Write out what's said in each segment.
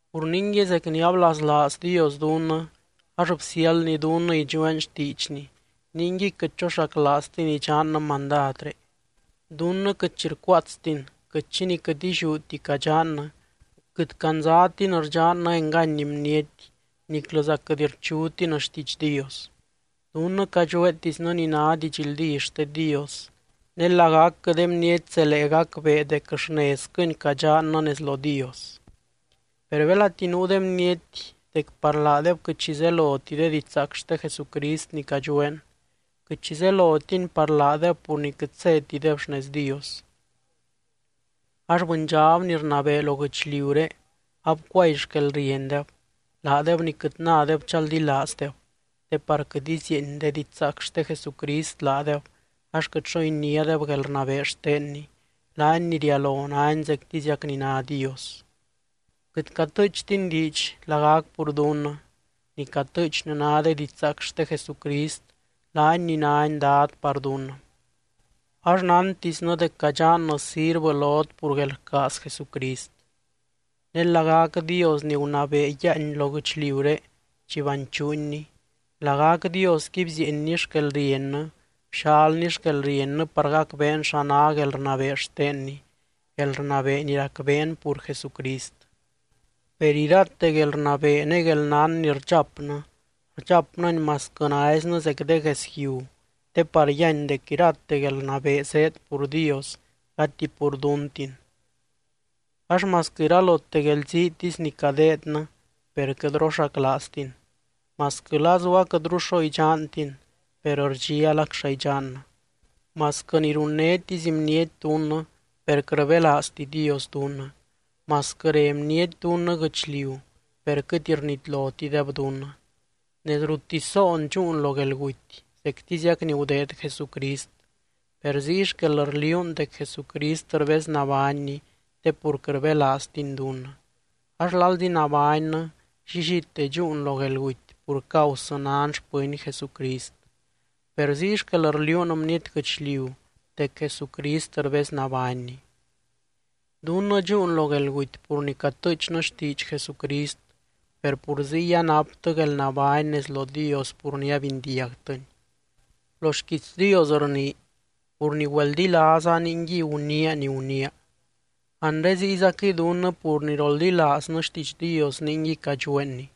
Pur ningui, zec ni ablaslaaz Dios dunnɨ ax bsiáldny dunnɨ idxueen xtiidxny, ningui quɨt choxaclaaztin idxannɨ mandadré. Dunnɨ quɨt xi rcuaatstin, quɨt xi ni quɨt illiúti cadxannɨ, quɨt candzatin rdxannɨ engany bniety niclɨza quɨt rchutin xtiidx Dios. Dunnɨ cadxueetisnɨ ni ná didxldí xte Dios, ne lagacquɨ de bniety zelee gacbee dec xnezquɨni cadxannɨ nez lo Dios. Per belati nuu de bniety dec par laadeb quɨt xi zeloti de didxzaac xte Jesucrist ni cadxueen, quɨt xi zelotini par laadeb pur ni quɨt zétideb xnez Dios. Ax bɨndxab ni rnabee lo guɨchliuré abcuay xquelriendeb, laadeb ni quɨt nádeb chaldilaazdeb, te par quɨt izieeny de didxzaac xte Jesucrist laadeb ax quɨt xo iniádeb guelrnabee xtenny, laany ni rialo nány zectiziac ni ná Dios. Quɨt catɨɨchtin diidx lagac pur dunnɨ, ni catɨɨchnɨ ná de didxzaac xte Jesucrist, laany ni nány Dad par dunnɨ. Ax nántisnɨ dec cadxannɨ sirvɨ lot pur guelrcaaz Jesucrist. Ne lagac Dios ni gunabee yiáany lo guɨchliuré chi banchuunni, lagac Diosqui bzieenny xquelriennɨ, bxalny xquelriennɨ par gacbeen xa ná guelrnabee xtenny, guelrnabee ni racbeen pur Jesucrist. Per irate guelrnabee ne guelnán ni rdxapnɨ, rdxapnɨni masquɨ naiznɨ zec de gues yiu te par yíany dec irate guelrnabee zéed pur Dios gati pur duntin. Ax masquɨ iralote guelziitisy ni cadeednɨ, per quɨt roxaclaaztin. Masquɨ lazu aquɨtru xo idxantin, per rdxialac xa idxannɨ. Masquɨ ni runnétisy bniety dunnɨ, per quɨt rbelaazti Dios dunnɨ. Masquɨ re bniety dunnɨ guɨchliu, per quɨt rnitlotideb dunnɨ. Nez ruttisy zoon dxúun lo guelguty zectiziac ni gudeed Jesucrist, per ziy xquel rliuun dec Jesucrist rbeznabánny te pur quɨt rbelaaztiny dunnɨ. Ax lalzi nabánnɨ, llillite dxúun lo guelguty pur causɨ nan xpɨny Jesucrist, per ziy xquel rliuun bniety guɨchliu dec Jesucrist rbeznabánny. Dunnɨ dxúun lo guelguty pur ni catɨɨchnɨ xtiidx Jesucrist, per pur ziy anaptɨ guelnabány nez lo Dios pur ni abindiagtɨny. Lo xquiits Dios rnii: “Pur ni güeldilaaza, ningui guniia ni guniia.” Anre ziyzaquɨy dunnɨ pur ni roldilaaznɨ xtiidx Dios ningui cadxueenni.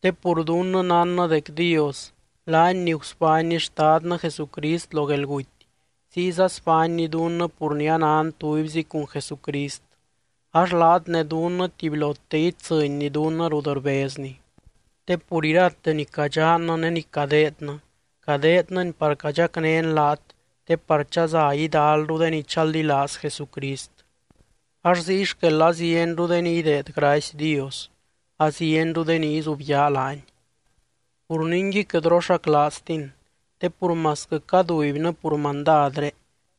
Te pur dunnɨ nánnɨ dec Dios, laany ni gusbánny Xtadnɨ Jesucrist lo guelguty, ziyza sbánny dunnɨ pur ni anan tubyzi cun Jesucrist ax laat ne dunnɨ tubylote itsɨnny dunnɨ rut rbezny. Te pur irate ni cadxannɨ ne ni cadeednɨ, cadeednɨni par cadxacnén laat te par chaza idalru de ni chaldilaaz Jesucrist. Ax ziy xquel azienru de ni ideed gracy Dios, azienru de ni izubyaa laany. Pur ningui quɨt roxaclaaztin. Te pur masquɨ cadubynɨ pur mandadré,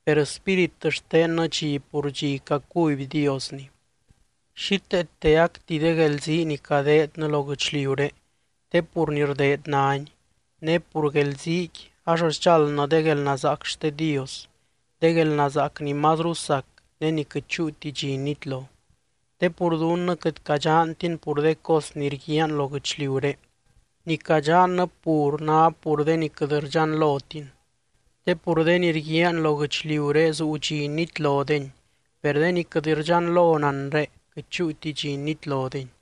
per spírit xtennɨ dxi pur dxi cacuby Diosni. Xíteeteacti de guelzii ni cadeednɨ lo guɨchliuré te pur ni rdeed náni, ne pur de guelziiqui ax sdxáldnɨ de guelnazaac xte Dios, de guelnazaac ni mazru sac ne ni quɨt chúuti dxi nitlo. Te pur dunnɨ quɨt cadxantin pur de cos ni rguiaan lo guɨchliuré, ni cadxannɨ pur ná pur de ni quɨt rdxanlotin. Te pur de ni rguiaan lo guɨchliuré zuu dxi nitlodeni, per de ni quɨt rdxanlon anre, quɨt chúuti dxi nitlodeni.